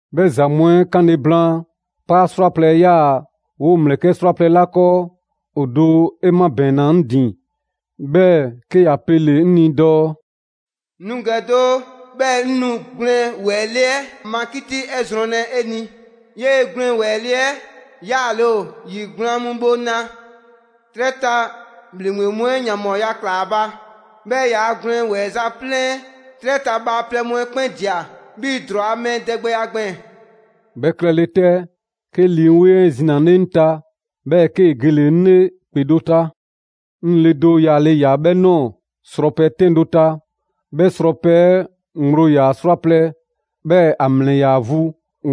'Bhɛ za mu 'ɛ 'kanle blaan, 'paa 'srwaplɛ‑ 'ɛ 'yaa‑ 'woo‑ ‑mlɛkɛ' 'srwaplɛ‑ 'la 'kɔɔ, ‑o do 'e 'mabɛɛnna 'ŋ ‑din, 'bhɛɛ‑ 'ke ‑ya pele‑ 'ŋ ni dɔɔ: «Nu ‑gɛ doo, 'bhɛɛ‑ 'ŋ nu gwlɛn ‑wɛɛ le 'ɛ ma 'kiti 'ɛ zrɔnlɛ 'e ni. 'Yee‑ gwlɛn ‑wɛɛ le 'ɛ 'yaale ‑o ‑yi gblaan mu bhoŋla. 'Trɛ ta ‑bhleŋgbe mu 'ɛ ‑yanbhɔɔya ꞊kla ‑a ba; 'bhɛɛ‑ ‑yaa' gwlɛn ‑wɛɛza' 'flɛn 'ɛ 'trɛ ta bhaaplɛŋ mu 'ɛ 'kpɛn ꞊dia 'bhii‑ ‑drɔɔ a mɛɛ dɛgbɛya gbɛɛn‑.» 'Bhɛ klɛle 'tɛ, 'ke Lii 'Weŋ 'ɛ zinale 'ŋ ta, 'bhɛɛ‑ 'kee‑ gele‑ 'ŋ 'le ‑kpe do ta. 'Ŋ le do yaale ‑ya 'bhɛ ꞊nɔɔ srɔpɛ 'tɛn do ta. 'Bhɛ srɔpɛ 'ɛ ŋgblo ‑yaa 'srwaplɛ‑, 'bhɛɛ‑ ‑a ‑mlɛ ‑yaa vu: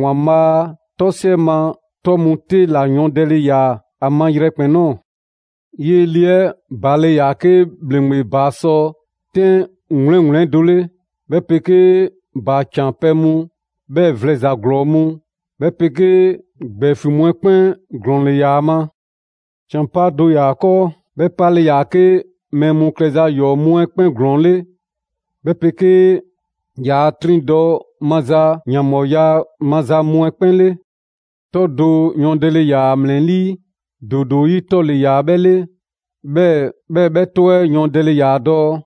‑Waanbhaa' 'tɔsiɛ ma 'tɔ mu 'te ‑la yɔɔndɛle ‑yaa ‑a ma yrɛkpɛn‑ ꞊nɔɔ. 'Yee‑ le 'ɛ ‑baale' ‑yaa 'ke ‑bhleŋgbe ‑baa 'sɔ 'tɛn 'wleŋwleŋ do 'le, 'bhɛ 'pegee ‑baa ‑can pɛ mu, 'bhɛɛ‑ vlɛ ‑za ‑glɔɔ mu, 'bhɛ 'pegee ‑gbɛɛfiŋ mu 'ɛ 'kpɛn ‑glɔɔn ‑le ‑yaa ‑a ma. ‑Can 'paa do ‑yaa ‑a 'kɔɔ, 'bhɛ 'pale‑ ‑yaa 'ke mɛɛ mu klɛza 'yɔɔ‑ mu 'ɛ 'kpɛn ‑glɔɔn 'le, 'bhɛ 'pegee ‑yaa 'triŋdɔ‑ maza ‑yanbhɔɔya maza mu 'ɛ 'kpɛn 'le. 'Tɔ do yɔɔndɛle ‑yaa ‑a ‑mlɛlii': ‑doodoo 'yi 'tɔ ‑le ‑yaa 'bhɛ 'le, 'bhɛɛ‑ 'bhɛ 'tɔ 'ɛ yɔɔndɛle ‑yaa dɔɔ: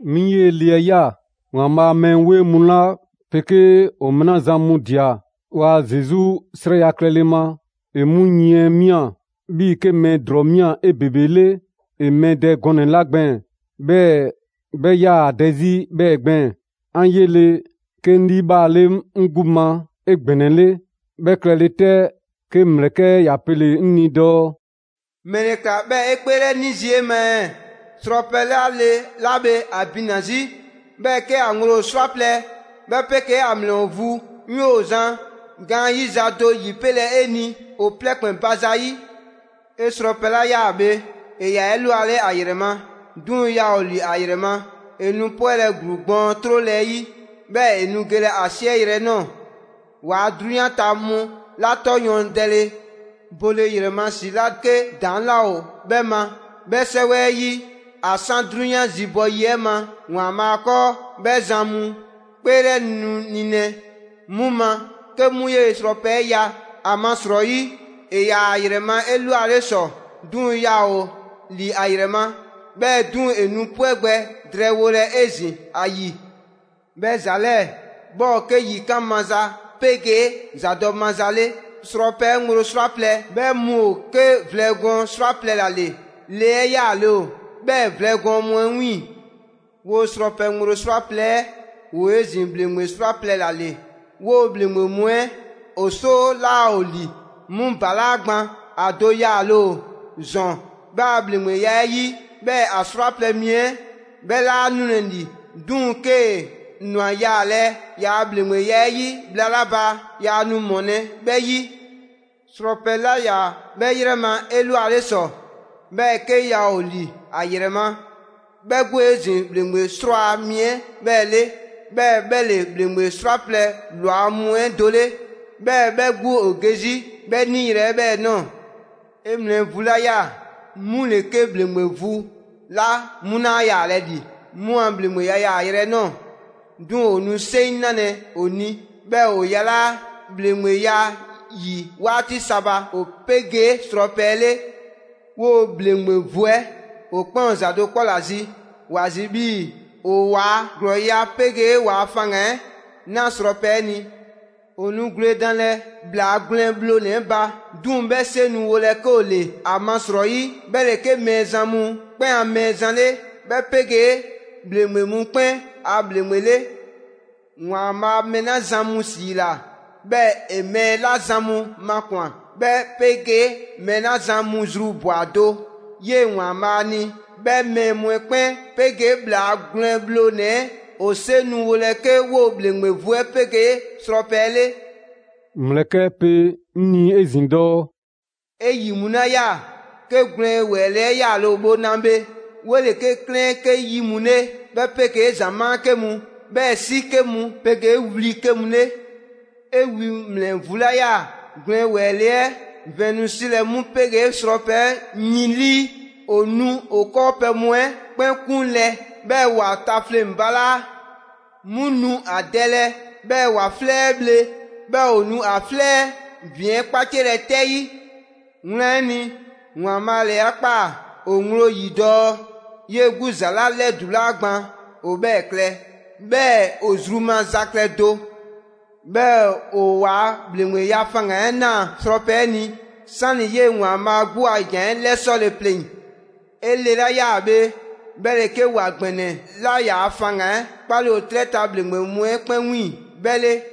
'Mi 'yee‑ le 'ɛ ꞊ya; ‑Waanbhaa' a mɛɛ 'weŋ mu 'la 'pegee ‑o mɛɛ 'la zan mu ꞊dia ‑waa' Zesu 'srɛya‑ klɛle ma, ‑e 'mu yiɛn 'ɛ ꞊mia, 'bhii‑ 'ke mɛɛ ‑drɔɔ ‑mia 'ebebele ‑e mɛɛ dɛ gɔɔnɛ‑ 'la gbɛɛn‑, 'bhɛɛ‑ 'bhɛ 'yaa‑ ‑a dɛ 'zi 'bhɛɛ‑ gbɛɛn‑. 'An 'yele‑, 'ke 'ŋ 'liibhaale 'ŋ 'gbu ma 'egbɛnɛle. 'Bhɛ klɛle 'tɛ, 'ke ‑mlɛkɛ' 'ɛ ‑ya pele‑ 'ŋ ni dɔɔ: «‑Mɛle ‑kla 'bhɛɛ‑ 'e 'kpeelɛni zii' 'e ma ɛɛ? Srɔpɛ 'la le 'la bhe ‑a bina‑ 'zi, 'bhɛɛ‑ 'ke ‑a ŋgblo ‑o 'srwaplɛ‑, 'bhɛ 'pegee ‑a ‑mlɛ ‑o vu, 'ŋ 'yoo‑ zan gaanyiza do 'yipelɛ 'e ni ‑o plɛ ‑kpɛn ba zayi'. 'E srɔpɛ 'la ꞊ya bhe, ‑e ‑yaa 'elwale ‑a ‑yrɛ ma; 'duŋ‑ yaa ‑o ‑li ‑a ‑yrɛ ma. ‑E nu 'pwɛlɛ‑ ‑gluu gbɔɔn 'trole 'ɛ 'yi, 'bhɛɛ‑ ‑e nu gelɛ ‑a 'siɛyrɛ‑ 'ɛ ꞊nɔɔ. Waa 'drunyan ta mu 'la 'tɔ yɔɔndɛle bole ‑yrɛ ma ‑si 'la 'ke ‑daŋ' 'laa ‑o 'bhɛ ma 'bhɛ 'sɛwɛ 'ɛ 'yi ‑a 'san 'drunyan zibɔ yi 'ɛ ma ‑Waanbhaa' 'kɔɔ, 'bhɛ zan mu 'kpeelɛ nu nilɛ 'mu ma 'ke 'mu 'yee‑ srɔpɛ 'ɛ ꞊ya. ‑Amasrɔyi, ‑e ‑yaa ‑a ‑yrɛ ma 'elwale ‑sɔ, 'duŋ‑ yaa ‑o ‑li ‑a ‑yrɛ ma, 'bhɛɛ‑ 'duŋ‑ ‑e nu 'pwɛ gbɛ drɛɛwolɛ 'ezin‑ ‑a ‑yi.» «'Bhɛ ‑za 'lɛɛ‑ 'bhɛ ‑o 'ke yikan' maza 'pegee ‑zadɔ' maza 'le. Srɔpɛ 'ɛ ŋgblo 'srwaplɛ‑ 'ɛ 'bhɛ mu ‑o 'ke vlɛ gɔɔn 'srwaplɛ‑ ‑la ‑le. Le 'ɛ 'yaale ‑o 'bhɛɛ‑ vlɛ gɔɔn mu 'ɛ 'wiiŋ‑. 'Woo‑ srɔpɛ ŋgblo 'srwaplɛ‑ 'ɛ, ‑woo' 'ezin‑ ‑bhleŋgbe 'srwaplɛ‑ ‑la ‑le: 'woo‑ ‑bhleŋgbe mu 'ɛ ‑o 'soo 'laa ‑o ‑li, 'mu ‑balaa' gban, ‑a do yaale ‑o ‑zɔn 'bhɛ a ‑bhleŋgbeya 'ɛ 'yi, 'bhɛɛ‑ ‑a 'srwaplɛ‑ mi 'ɛ 'bhɛ 'laa nulɛ ‑li. 'Duŋ‑ 'kee‑ ‑nwa yaalɛ ‑yaa' ‑bhleŋgbeya 'ɛ 'yi bhla 'la ba, yaa nu ‑mɔlɛ' 'bhɛ 'yi. Srɔpɛ 'la 'yaa‑ 'bhɛ 'yrɛ ma 'elwale ‑sɔ, 'bhɛɛ‑ 'ke yaa ‑o ‑li ‑a ‑yrɛ ma, 'bhɛ 'gbu ‑o 'ezin‑ ‑bhleŋgbe 'srwaa‑ mi 'ɛ 'bhɛɛ‑ 'le. 'Bhɛɛ‑ 'bhɛ ‑le ‑bhleŋgbe 'srwaplɛ‑ ‑lwa mu 'ɛ do 'le‑, 'bhɛɛ‑ 'bhɛ 'gbu ‑o ge 'zi 'bhɛ 'niyrɛ‑ 'ɛ 'bhɛɛ‑ ꞊nɔɔ.» «'E ‑mlɛ vu 'la ꞊ya, 'mu ‑le 'ke ‑bhleŋgbe vu 'la 'mu laa yaalɛ ‑li 'mu a ‑bhleŋgbeya yaayrɛ 'ɛ ꞊nɔɔ; 'duŋ‑ ‑o nu 'seŋ 'nalɛ‑ ‑o ni, 'bhɛɛ‑ ‑o yalaa' ‑bhleŋgbeya 'yi 'waati sa ba ‑o 'pegee srɔpɛ 'ɛ 'le. 'Woo‑ ‑bhleŋgbe vu 'ɛ ‑o 'kpɛn ‑o ‑za do 'kpɔ ‑la zi: woo ‑a zi 'bhii‑ ‑o ‑waa' ‑glɔɔya' 'pegee waa faŋgan‑ 'ɛ 'na srɔpɛ 'ɛ ni. ‑O nu gwledanlɛ ‑Bhlaa Gwlɛn Bhlonɛ‑ 'ɛ ba, 'duŋ‑ 'bhɛ 'seŋ nu wolɛ 'ke ‑o ‑le. ‑Amasrɔyi 'bhɛ ‑le 'ke Mɛɛzan mu 'kpɛn a Mɛɛzan 'le, 'bhɛ 'pegee ‑bhleŋgbe mu 'kpɛn a ‑Bhleŋgbe 'le. ‑Waanbhaa' mɛɛ 'la zan mu ‑siila, 'bhɛɛ‑ ‑e mɛɛ 'la zan mu makwan‑, 'bhɛ 'pegee mɛɛ 'la zan mu zru ꞊bwa do 'yee ‑Waanbhaa' ni, 'bhɛ mɛɛ mu 'ɛ 'kpɛn 'pegee ‑Bhlaa Gwlɛn Bhlonɛ‑ 'ɛ ‑o 'seŋ nu wolɛ 'ke 'woo‑ ‑bhleŋgbe vu 'ɛ 'pegee srɔpɛ 'ɛ 'le.» ‑Mlɛkɛ' 'ɛ pe 'ŋ ni 'ezin‑ dɔɔ: «'E ‑yi mu 'la ꞊ya, 'ke gwlɛn ‑wɛɛ le 'ɛ 'yaale‑ ‑o bhoŋla bhe, 'wole‑ 'ke 'klɛɛn 'ke 'yi mu 'le, 'bhɛ 'pegee ‑zamaa' 'ke mu, 'bhɛɛ‑ 'si 'ke mu 'pegee wli 'ke mu 'le. 'E wi ‑mlɛ vu 'la ꞊ya gwlɛn ‑wɛɛ le 'ɛ vɛn nu 'silɛ‑ 'mu 'pegee srɔpɛ 'ɛ yin 'lii. ‑O nu ‑a 'kɔɔpɛ‑ mu 'ɛ 'kpɛn 'kunlɛ‑, 'bhɛɛ‑ ‑wa tafleŋ‑ balaa'. 'Mu nu ‑a dɛlɛ, 'bhɛɛ‑ ‑wa 'flɛ 'ɛ bhle, 'bhɛɛ‑ ‑o nu ‑a 'flɛ ‑vin 'ɛ 'kpaciɛlɛ 'tɛ 'yi. Wlan 'ɛ ni, ‑Waanbhaa' ‑le 'a ꞊kpaa ‑o ŋgblo ‑yi dɔɔ 'yee‑ 'gbu ‑za 'la 'lɛdulaa gban ‑o 'bhɛɛ‑ klɛ, 'bhɛɛ‑ ‑o zru maza klɛ do; 'bhɛɛ‑ ‑o waa ‑bhleŋgbeya faŋgan‑ 'ɛ 'na srɔpɛ 'ɛ ni, 'sani‑ 'yee‑ ‑Waanbhaa' 'gbu a ‑jan 'ɛ 'lɛsɔle pleŋ‑.» «'E le 'la ꞊ya bhe, 'bhɛ ‑le 'ke ‑wa ‑gbɛnɛ 'la ‑yaa' faŋgan‑ 'ɛ 'kpaale‑ ‑o 'trɛ ta ‑bhleŋgbe mu 'ɛ 'kpɛn 'wiiŋ‑ 'bhɛ 'le.»